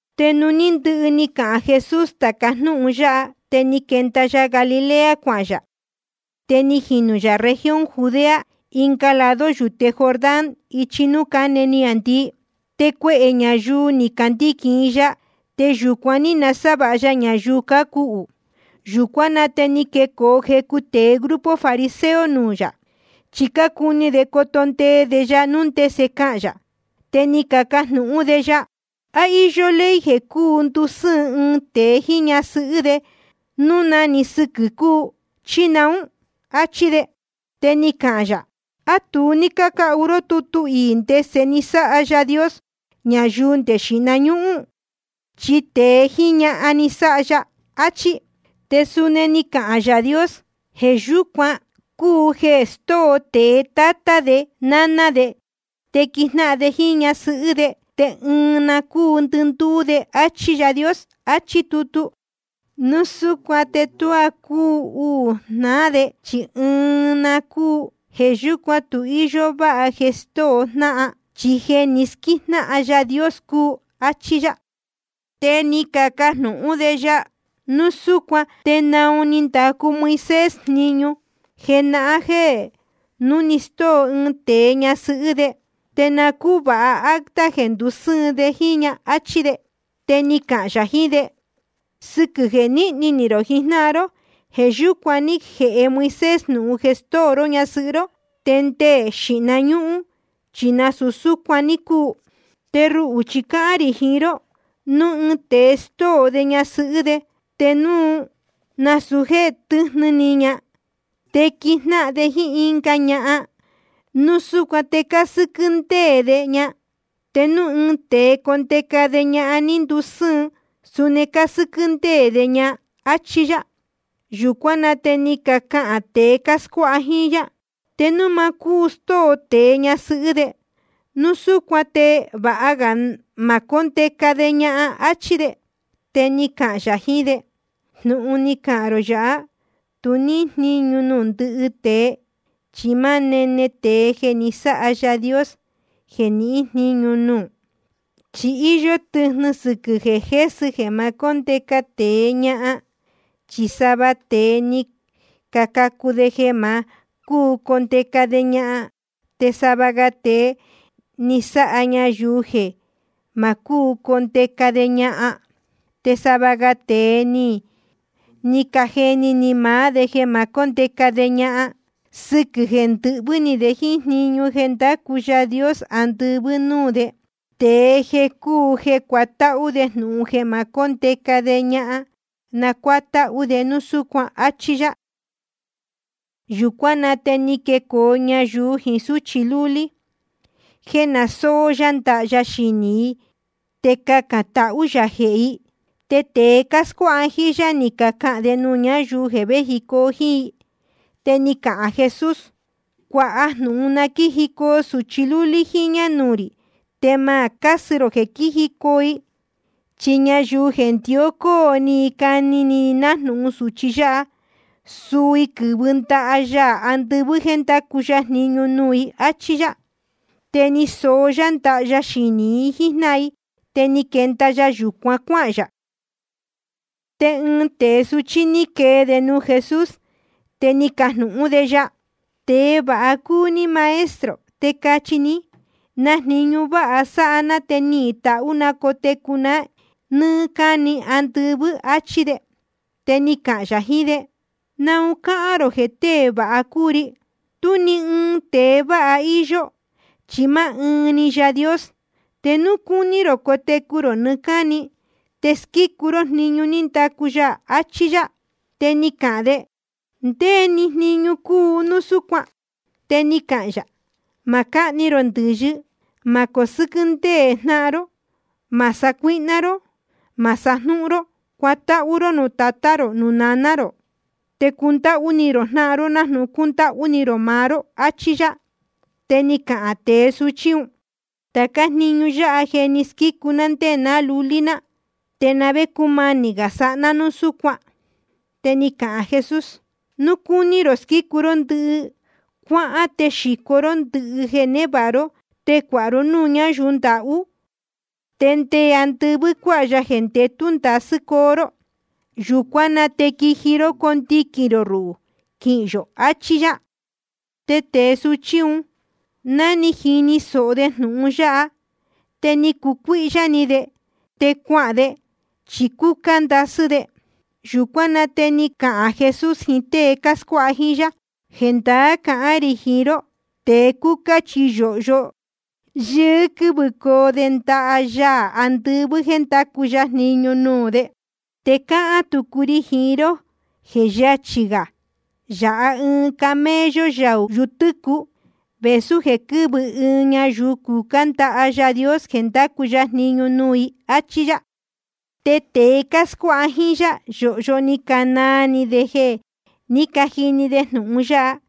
Te nuū ní ndɨhɨ ni cahān Jesús tāca jnúhun yáha, te ni quenda ya Galilea cuahān yā. Te ni jinū yā región Judea, ɨnga lado yūte Jordán, ichi núū cáne niāndii. Te cuehē ñayuu ni candiquīn i ya, te yūcuan ní nasávāha ya ñayuu cácuhū. Yūcuán na te ni quecoo jecu tēe grupo fariseo nuū yā, chi cácuni de coto ndee de ya núu ndese cahān yā. Te ni cacajnūhún de ya: ¿A íyó ley jeē cuu ndusɨ́ɨn ɨɨn tēe jíín ñasɨhɨ́ de núu na‑ni sɨquɨ̄ cúu, chí naún? áchí de. Te ni cahān yā: ¿A tu ní cácahu ró tutu iī ndese ni sáha Yaā Dios ñayuu nde xīhna ñúhún? Chi tēe jíín ñahan ni sáha ya, achí. Te suni ni cahān Yaā Dios: Jeē yúcuan cúu jeē stóo tēe tátá de náná de, te quijnáhan de jíín ñasɨhɨ́ de, te ɨɨn na cuu ndɨndúú de, áchí Yaā Dios, achí tutu. Núu súcuan te tuá cúu uū jnáhan de, chi ɨɨn na cúu. Jeē yúcuan tu íyó váha jeē stóo jnáhan, chi jeē ni squíjnáhan Yaā Dios cúu, áchí yá. Te ni cacajnūhún de ya: Núu súcuan ¿te naun ni ndacu Moisés jniñu jenahán jeē núu stóo ɨɨn tēe ñasɨhɨ́ de, te na cúvāha acta jeē ndusɨ́ɨn de jíín ña? áchí de. Te ni cahān yā jiín de: Sɨquɨ̄ jeē níhni ni rō jijnáhan ró, jeē yúcuan ní jēhe Moisés jnūhun jeē stóo ró ñasɨhɨ́ ró. Te nde xīhna ñúhún chi nasūu súcuan ní cuu. Te ruhū chi cáhán rī jiín ró, núu ɨɨn tēe stóo de ñasɨhɨ́ de, te núu nasūu jéē tɨ́jnɨ ni ña, te quijnáhan de jíín ɨnga ñahan, núu súcuan te cásɨ́quɨ́ ndéē de ña. Te núu ɨɨn tēe condeca de ñahan ní ndusɨ́ɨn, suni cásɨ́quɨ́ ndéē de ña, áchí yá. Yūcuán na te ni cacahān tēe cáscuáha jíín yá: Te núu ma cúu stóo tēe ñasɨhɨ́ de, núu súcuan te vāha ga ma cóndeca de ñahan, áchí de. Te ni cahān yā jiín de: Jnūhun ni cahān rō yāhá, tu níhín jníñu nuū ndɨhɨ tēe, chi máá nene tēe jeē ni sáha Yaā Dios jeē nihín jníñu nuū. Chi íyó tɨjnɨ sɨquɨ̄ jeē jésɨ jeē ma cóndeca tēe ñahan. Chi sava tēe ni cacacu de jeē ma cúu condeca de ñahan. Te sava ga tēe ni sáha ñayuu jeē ma cúu condeca de ñahan. Te sava ga tēe ni cajeni ni maá de jeē ma cóndeca de ñahan sɨquɨ̄ jeē ndɨhvɨ́ ni de jíín jniñu jeē ndácu Yaā andɨvɨ́ nuū de. Tēe jeē cúu cuatáhú jnúhun jeē ma cóndeca de ñahan, na cuátáhú de núu súcuan. Achí yá. Yūcuán na te ni quecoo ñayuu jiín súchi lúlí, jéē na sóó yá ndaha ya xinī i te cacān tahú yā jehē i. Te tēe cáscuáha jíín yá, ni cacahān de nuū ñáyuu vējicoo jíín i. Te ni cahān Jesús: Cuāha jnūhun na quíjicoo sūchi lúlí jíñā nuū rī, te ma cásɨ rō jeē quíjicoo i. Chi ñayuu jeē ndió cóo ni i cani ni i nájnūhun sūchi yáha, suu i quɨ́vɨ ndaha Yaā andɨvɨ́ jéē ndacu ya jniñu nuū i, áchí yá. Te ni soó yá ndaha ya xinī i jíjnáhan i. Te ni quenda ya yūcuan cuáhān yā. Te ɨɨn tēe suchí ní quee de nuū Jesús, te ni cajnūhún de ya: Tēe vāha cúu ní Maestro. Te cachi ní, ¿na jniñu váha sáha ná te nihīn tahú na cotecu na nɨ́ɨ́ cáni andɨvɨ́? áchí de. Te ni cahān yā jiín de: ¿Naun cáhán rō jeē tée vāha cúu ri? Tú ni ɨɨn tēe vāha íyó, chi máá ɨɨn‑ni Yaā Dios. Te núu cúní rō cotecu rō nɨɨ́ cáni, te squícu ró jniñu ní ndacu ya. Achí yá. Te ni cahān de: ¿Ndé‑ni jniñu cúu núu súcuan? Te ni cahān yā: Ma cáhni rō ndɨ̄yɨ. Ma cosɨ́quɨ́ ndéē jnáhan ró. Ma sacuíhná ró. Ma sajnúhún ró. Cuatáhú ró nuū tatá rō nuū naná rō. Te cundáhú ni rō jnáhan ró nájnūhun cúndáhú ni rō maá ró, achí yá. Te ni cahān tēe suchí un: Tācá jniñu yáha je ni squícu ná ndé ná lulí ná. ¿Te na vé cúmanī gā sáha ná núu súcuan? Te ni cahān Jesús: Núu cúní rō squícu ndɨhɨ ró, cuáhán te xīco ró ndɨhɨ jeē névāha ró, te cuāha ró núū ñáyuu ndahú. Te nde andɨvɨ́ cuáha ya jeē ndetū ndasɨ́ coo ró. Yūcuán na te quiji ró condiquīn rō ruhū quihīn yō, achí yá. Te tēe suchí un, ná ni jini sōho de jnūhun yáha, te ni cucuíhyá ni de te cuahān de, chi cúcá ndasɨ́ de. Yūcuán na te ni cahān Jesús jiín tée cáscuáha jíín yá: Jendaá cahán rī jiín ró, tēe cúcá chi yōhyo yɨɨ́ quɨ́vɨcoo de ndaha Yaā andɨvɨ́ jéē ndacu ya jniñu nuū de. Te cáhán tucu ri jiín ró jeē yachī gā yāha ɨɨn camello yaū yutɨ́cuɨ, vēsú jeē quɨ́vɨ ɨɨn ñayuu cucá ndaha Yaā Dios jeē ndacu ya jniñu nuū i, áchí yá. Te tēe cáscuáha jíín yá, yōhyo ni canaa ni de jeē ní cajini de jnūhun yáha,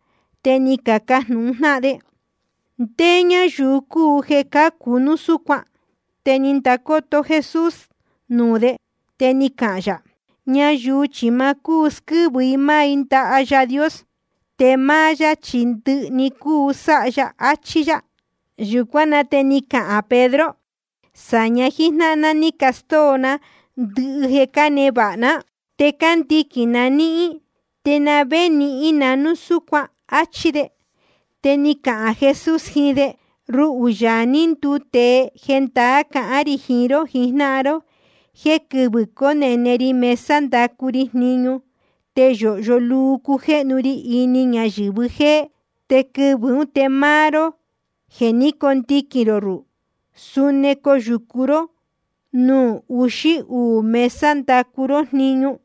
te ni cacajnūhun jnáhan de: ¿Ndé ñáyuu cúu jeē cácu núu súcuan? Te ni ndacoto Jesús nuū de, te ni cahān yā: Ñayuu chi ma cúu squɨ́vɨ i máá i ndaha Yaā Dios, te máá yá chi ndɨhɨ‑ni cuu sáha ya, achí yá. Yūcuán na te ni cahān Pedro: Sāña jíjnáhan ná ní castóo ná ndɨhɨ jeē cánevāha ná, te cándiquīn na níhín. ¿Te na vé nihín na núu súcuan? áchí de. Te ni cahān Jesús jiín de: Ruhū, Yaā ní nduu tēe, jendaá cahán rī jiín ró jijnáhan ró jéē ɨɨn quɨvɨ̄ conene rī mesa ndacu ri jniñu, te yōhyo luu cujéhnu ri ini ñayɨ̄vɨ jéé. Te quɨvɨ̄ ún te máá ró jeē ní cacondiquīn rō ruhū, suni coyūcu ró nuū uxí uū mesa ndacu ró jniñu.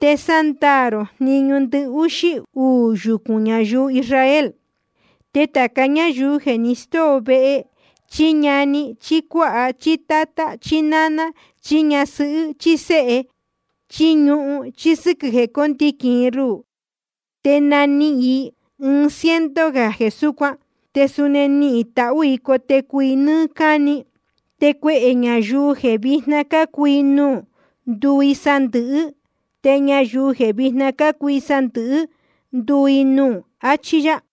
Te sándaā rō jniñu ndɨhúxí uū yucūn ñayuu Israel. Te tāca ñáyuu jeē ni stóo vehe, chí ñani, chí cuáha, chí tátá, chí náná, chí ñasɨhɨ́, chí séhe, chí ñuhun, sɨquɨ̄ jeē cóndiquīn i ruhū, te nanihīn i ɨɨn ciento gā jeē súcuan. Te suni nihīn tahú i cotecu i nɨ́ɨ́ cáni. Te cuehē ñayuu jeē vijna cácuu i nuū, nduu i sandɨ̄hɨ́. Te ñayuu jeē vijna cácuu i sandɨ̄hɨ́, nduu i nuū. Achí yá.